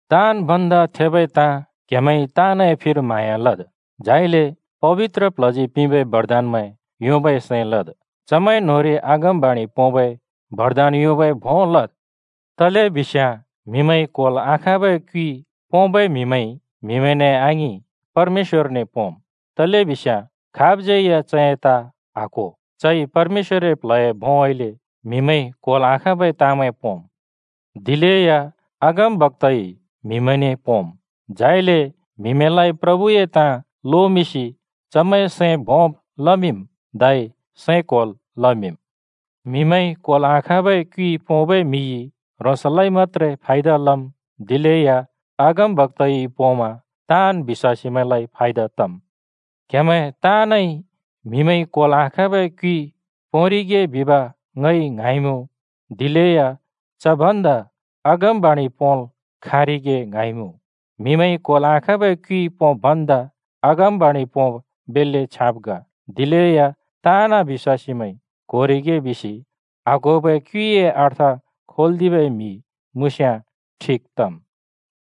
ताँन् भन्दा थेबै ताँ क्हेमैंइ ताँनए फिर म्हाँया लद्। झाइले पबित्र प्ल्हजी पिंबै बरदानमैं योंबै सैं लद्। चमैं न्होंरि अगमबाणि पोंबै बरदान योंबै भों लद्। तलेबिस्याँ म्हिमैंइ क्होल् आखाँबै क्युइ पोंबै म्हिमैंइ म्‍हिमैंने आङिं, परमेश्‍वरने पोंम्, तलेबिस्याँ खाबज्‍यै या चए ताँ आक्‍हो। चइ परमेश्‍वरए प्ल्हए भोंउँइँले म्हिमैंइ क्होल् आखाँबै ताँमैं पोंम्। दिलेया अगमबक्‍ताइ म्‍हिमैंने पोंम्, झाइले म्‍हिमैंलाइ प्रभुए ताँ लोमिंसि चमैंए सैं भोंब् लमिंम् धै सैं क्‍होल् लमिंम्। म्हिमैंइ क्होल् आखाँबै क्युइ पोंबै म्‍हिइ ह्रोंसलाइ मत्‍त्रे फायदा लम्, दिलेया अगमबक्‍ताइ पोंमा ताँन् बिश्‍वासीमैंलाइ फायदा तम्। क्‍हेमैं ताँनइ म्हिमैंइ क्होल् आखाँबै क्युइ पोंरिगे बिब ङइ ङ्हाँइमुँ, दिलेया च भन्दा अगमबाणि पोंल् खाँरिगे ङ्हाँइमुँ। म्हिमैंइ क्होल् आखाँबै क्युइ पोंब् भन्दा अगमबाणि पोंब बेल्‍ले छ्याँब ग। दिलेया ताँन् बिश्‍वासीमैंइ क्होरिगे बिसि आक्होबै क्युइए अर्थ खोल्दिबै म्‍हि मुँस्‍याँ ठिक तम्।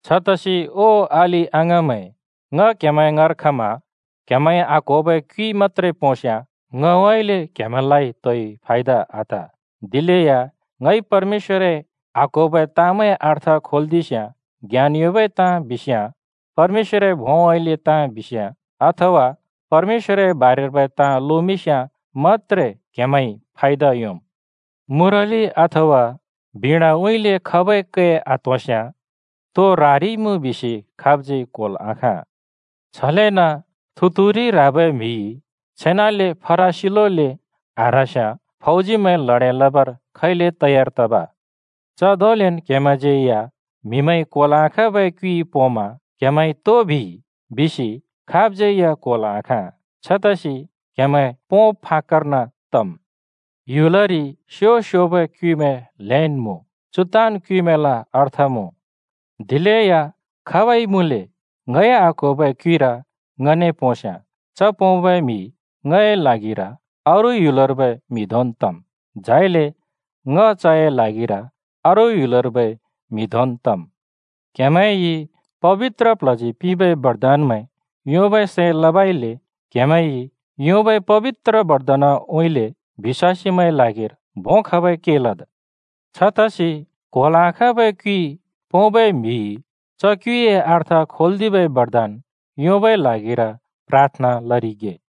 छतसि ओ अलि-अङाँमैं, ङ क्‍हेमैं ङाँर खमा क्हेमैंइ आक्होबै क्युइ मत्‍त्रे पोंस्‍याँ ङउँइँले क्‍हेमैंलाइ तोइ फायदा आत। दिलेया ङइ परमेश्‍वरए आक्होबै ताँमैंए अर्थ खोल्‍दिस्‍याँ, ज्ञान योंबै ताँ बिस्‍याँ, परमेश्‍वरए भोंउँइँले ताँ बिस्‍याँ, अथवा परमेश्‍वरए बारेर्बै ताँ लोमिंस्‍याँ मत्‍त्रे क्‍हेमैंइ फायदा योंम्। मुरलि अथवा बिणाउँइँले खबै कै आत्होंस्याँ तो ह्रारिइमुँ बिसि खाबज्‍यै क्‍होल् आखाँ। छलेन थुतुरु ह्राबै म्‍हिइ छेनाले फरासिलोले आह्रास्‍याँ फौजीमैं ल्हडें लबर खैले तयार तब? च धोंलेन् क्हेमैंज्यै या म्हिमैंइ क्होल् आखाँबै क्युइ पोंमा “क्हेमैंइ तो बिइ?” बिसि खाबज्‍यै या क्‍होल् आखाँ। छतसि क्‍हेमैं पोंब फाक्‍कर्न तम्। ह्‍युलरि स्यो स्योबै क्युइमैं ल्‍हेन् मुँ, चु ताँन् क्युइमैंल अर्थ मुँ। दिलेया खाबइ मुँले ङइ आक्‍होबै क्युइर ङने पोंस्‍याँ च पोंबै म्‍हि ङए ल्हागिर अरू ह्‍युलर्बै म्हि धोंन् तम्, झाइले ङ चए ल्हागिर अरू ह्‍युलर्बै म्हि धोंन् तम्। क्हेमैंइ पबित्र प्ल्हजी पिंबै बरदानमैं योंबै सैं लबइले क्हेमैंइ योंबै पबित्र बरदानउँइँले बिश्‍वासीमैंए ल्हागिर भों खबै के लद्। छतसि क्होल् आखाँबै क्युइ पोंबै म्‍हिइ च क्युइए अर्थ खोल्‍दिबै बरदान योंबै ल्हागिर प्राथना लरिगे।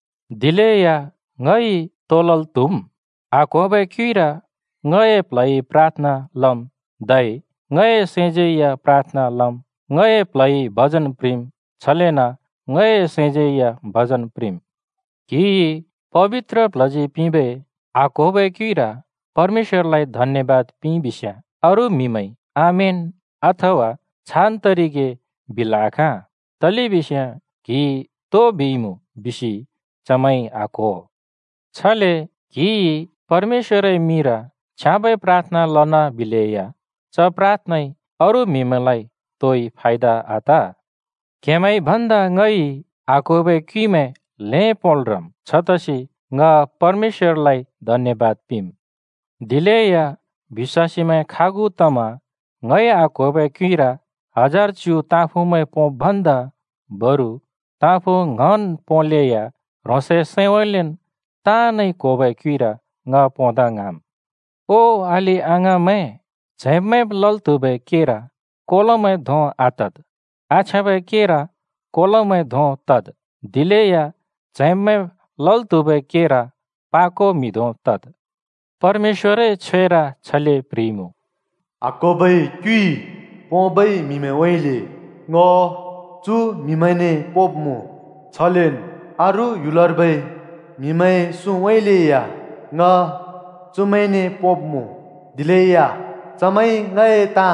दिलेया ङइ तो लल् त्‍हुम्? आक्होबै क्युइर ङए प्ल्हइ प्राथना लम्, धै ङए सैंज्‍यैया प्राथना लम्। ङए प्ल्हइ भजन प्रिंम्, छलेन ङए सैंज्‍यैया भजन प्रिंम्। क्‍हिइ पबित्र प्ल्हजी पिंबै आक्होबै क्युइर परमेश्‍वरलाइ धन्‍यबाद पिंइबिस्‍याँ अरू म्‍हिमैंइ “आमेन,” अथवा छान तरिगे, बिल् आखाँ। तलेबिस्याँ क्‍हिइ तो बिइमुँ बिसि चमैंइ आक्‍हो। छले क्‍हिइ परमेश्‍वरए मिंर छ्याँबै प्राथना लनाबिलेया च प्राथनाइ अरू म्‍हिमैंलाइ तोइ फायदा आत। क्हेमैंइ भन्दा ङइ आक्होबै क्युइमैं ल्हें पोंल् ह्रम्। छतसि ङ परमेश्‍वरलाइ धन्‍यबाद पिंम्। दिलेया बिश्‍वासीमैं खागु तमा ङइ आक्होबै क्यइर हजार च्यु ताँफुँमैं पोंब् भन्दा बरु ताँफुँ ङ्‍हन् पोंलेया ह्रोंसए सैंउँइँलेन् ताँनइ क्होबै क्युइर ङ पोंदा ङ्हाँम्। ओ अलि-अङाँमैं, च्हैंब्-मैंब् लल् त्हुबै केर कोलोमैं धों आतद्। आछ्याँबै केर कोलोमैं धों तद्, दिलेया च्हैंब्-मैंब् लल् त्हुबै केर पाको म्हि धों तद्। परमेश्‍वरए छ्वेर छले प्ह्रिइमुँ, “आक्होबै क्युइ पोंबै म्‍हिमैंउँइँले ङ चु म्हिमैंने पोंब्मुँ, छलेन् अरू ह्‍युलर्बै म्हिमैंए सुँउँइँले या ङ चुमैंने पोंब्‍मुँ। दिलेया चमैंइ ङए ताँ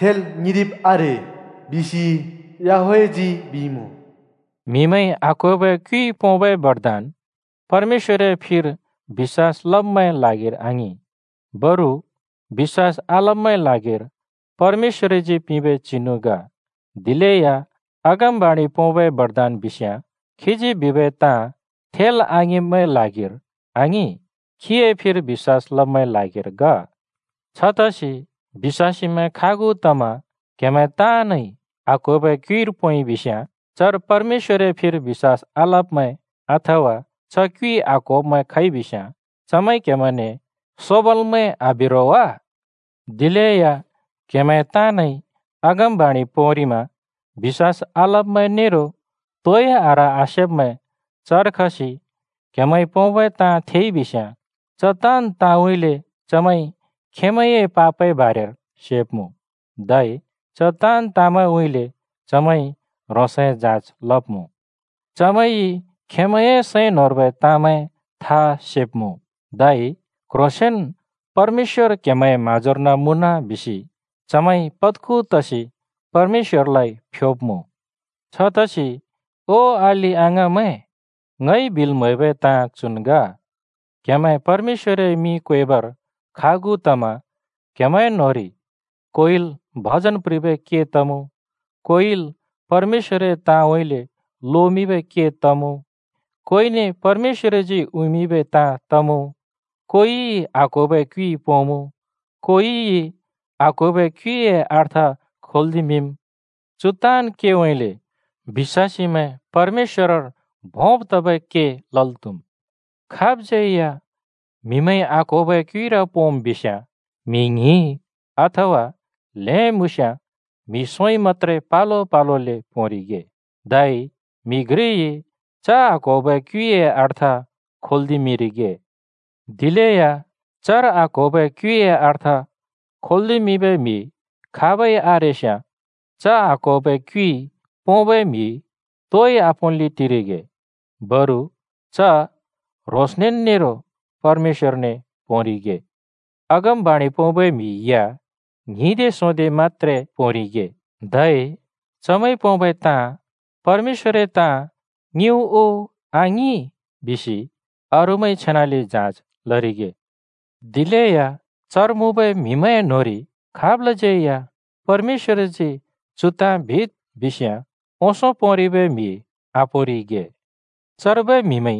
थेल् ङिंरिब आरे बिसि याहवेहजी बिइमुँ।” म्हिमैंइ आक्होबै क्युइ पोंबै बरदान परमेश्‍वरए फिर बिश्‍वास लब्‍मैंए ल्हागिर आङिं, बरु बिश्‍वास आलब्‍मैंए ल्हागिर परमेश्‍वरजी पिंबै चिनु ग। दिलेया अगमबाणि पोंबै बरदान बिस्याँ खीजी बिबै ताँ थेल् आङिंब्‍मैंए ल्हागिर आङिं, खीए फिर बिश्‍वास लब्‍मैंए ल्हागिर ग। छतसि बिश्‍वासीमैं खागु तमा क्‍हेमैं ताँनइ आक्होबै क्युइर पोंइबिस्‍याँ, चर परमेश्‍वरए फिर बिश्‍वास आलब्‍मैं अथवा च क्युइ आक्होब्मैं खइबिस्याँ चमैंइ क्‍हेमैंने सोबालमैं आबि रो वा? दिलेया क्‍हेमैं ताँनइ अगमबाणि पोंरिमा बिश्‍वास आलब्‍मैं नेरो तोइ आह्र-आसेब्मैं चर खसि क्हेमैंइ पोंबै ताँ थेइबिस्‍याँ, च ताँन् ताँउँइँले चमैंइ खेंमैंए पापए बारेर सेब्मुँ, धै च ताँन् ताँमैंउँइँले चमैंइ ह्रोंसए जाँच लब्‍मुँ। चमैंइ खेंमैंए सैं न्‍होंर्बै ताँमैं था सेब्मुँ, धै “क्‍ह्रोंसेंन परमेश्‍वर क्‍हेमैंए म्‍हाँजोर्न मुँन,” बिसि चमैंइ पद्खु तसि परमेश्‍वरलाइ फ्‍योब्‍मुँ। छतसि ओ अलि-अङाँमैं, ङइ बिल् म्हैबै ताँ चुन् ग: क्‍हेमैं परमेश्‍वरए मिं क्वेबर खागु तमा क्हेमैं न्होंरि कोइल भजन प्रिंबै के तमुँ, कोइल परमेश्‍वरए ताँउँइँले लोमिंबै के तमुँ, कोइने परमेश्‍वरजी उँइँमिंबै ताँ तमुँ, कोइइ आक्होबै क्युइ पोंमुँ, कोइइ आक्होबै क्युइए अर्थ खोल्दिमिंम्। चु ताँन् केउँइँले बिश्‍वासीमैं परमेश्‍वरर भोंब् तबै के लल् त्हुम्। खाबज्‍यै या म्हिमैंइ आक्होबै क्युइर पोंम् बिस्‍याँ म्‍हि ङ्हिं, अथवा ल्हें मुँस्‍याँ म्‍हि सोंइ मत्‍त्रे पलो पलोले पोंरिगे। धै म्‍हि घ्रिइ च आक्होबै क्युइए अर्थ खोल्दिमिंरिगे। दिलेया चर आक्होबै क्युइए अर्थ खोल्दिमिंबै म्‍हि खाबै आरेस्याँ च आक्होबै क्युइ पोंबै म्‍हि तोइ आपोंल्‍ले टिरिगे। बरु च ह्रोंसनेन् नेरो परमेश्‍वरने पोंरिगे। अगमबाणि पोंबै म्हि या ङ्हिंदे सोंदेइ मत्‍त्रे पोंरिगे। धै चमैंइ पोंबै ताँ परमेश्‍वरए ताँ ङिंउ उ आङि? बिसि अरूमैंइ छेनाले जाँच लरिगे। दिलेया चर मुँबै म्हिमैंए न्होंरि खाबलाज्यै या परमेश्‍वरजी “चु ताँ बिद्” बिस्याँ, ओंसों पोंरिबै म्‍हि आपोंरिगे। चर्बै म्हिमैं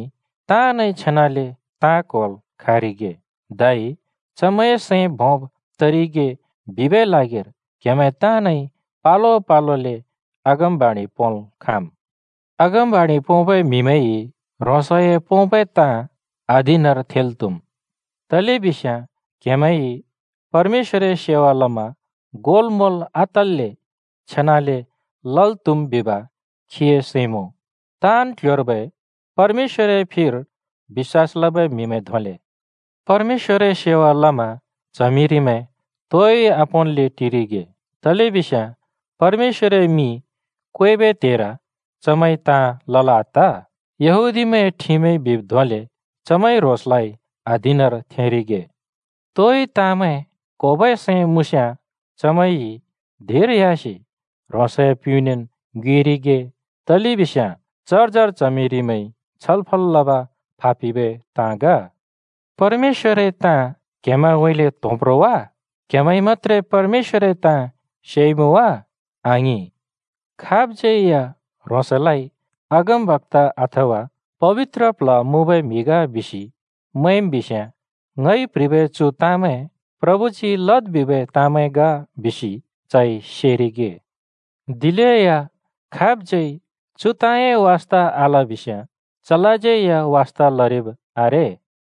ताँनइ छेनाले ताँ क्होल् खाँरिगे धै चमैंए सैं भोंब् तरिगे बिबै ल्हागिर क्हेमैं ताँनइ पलो पलोले अगमबाणि पोंल् खाँम्। अगमबाणि पोंबै म्‍हिमैंइ ह्रोंसए पोंबै ताँ अधीनर थेंल् त्हुम्। तलेबिस्याँ क्हेमैंइ परमेश्‍वरए सेवा लमा गोलमोल आतल्‍ले छेनाले लल् त्हुम् बिब खीए सैं मुँ। ताँन् क्‍ल्‍ह्‍योर्बै परमेश्‍वरए फिर बिश्‍वास लबै म्‍हिमैं धोंले परमेश्‍वरए सेवा लमा च्हमिरिमैं तोइ आपोंन्ले टिरिगे, तलेबिस्याँ परमेश्‍वरए मिं क्वेबै त्हेर चमैंइ ताँ लल् आत। यहूदीमैंए ठिमइ बिब् धोंले चमैंइ ह्रोंसलाइ अधीनर थेंरिगे। तोइ ताँमैं क्होबै सैं मुँस्‍याँ चमैंइ धिंर ह्‍यासि ह्रोंसए प्‍युँनेन् ङ्योएरिगे, तलेबिस्याँ चर्जर च्हमिरिमैंइ छलफल लब फापिबै ताँ ग। परमेश्‍वरए ताँ क्‍हेमैंउँइँले त्‍होंब् रो वा? क्‍हेमैंइ मत्‍त्रे परमेश्‍वरए ताँ सेइमुँ वा? आङिं! खाबज्यै या ह्रोंसलाइ अगमबक्‍ता अथवा पबित्र प्ल्ह मुँबै म्‍हि ग बिसि मैंम् बिस्याँ, ङइ प्‍ह्रिबै चु ताँमैं प्रभुजी लद् बिबै ताँमैं ग बिसि चइ सेरिगे। दिलेया खाबज्यै चु ताँए वास्ता आलबिस्याँ, चलाज्यै या वास्ता लरिब आरे।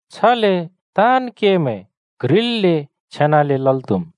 छले ताँन् केमैं क्ह्रिल्‍ले छेनाले लल् त्हुम्।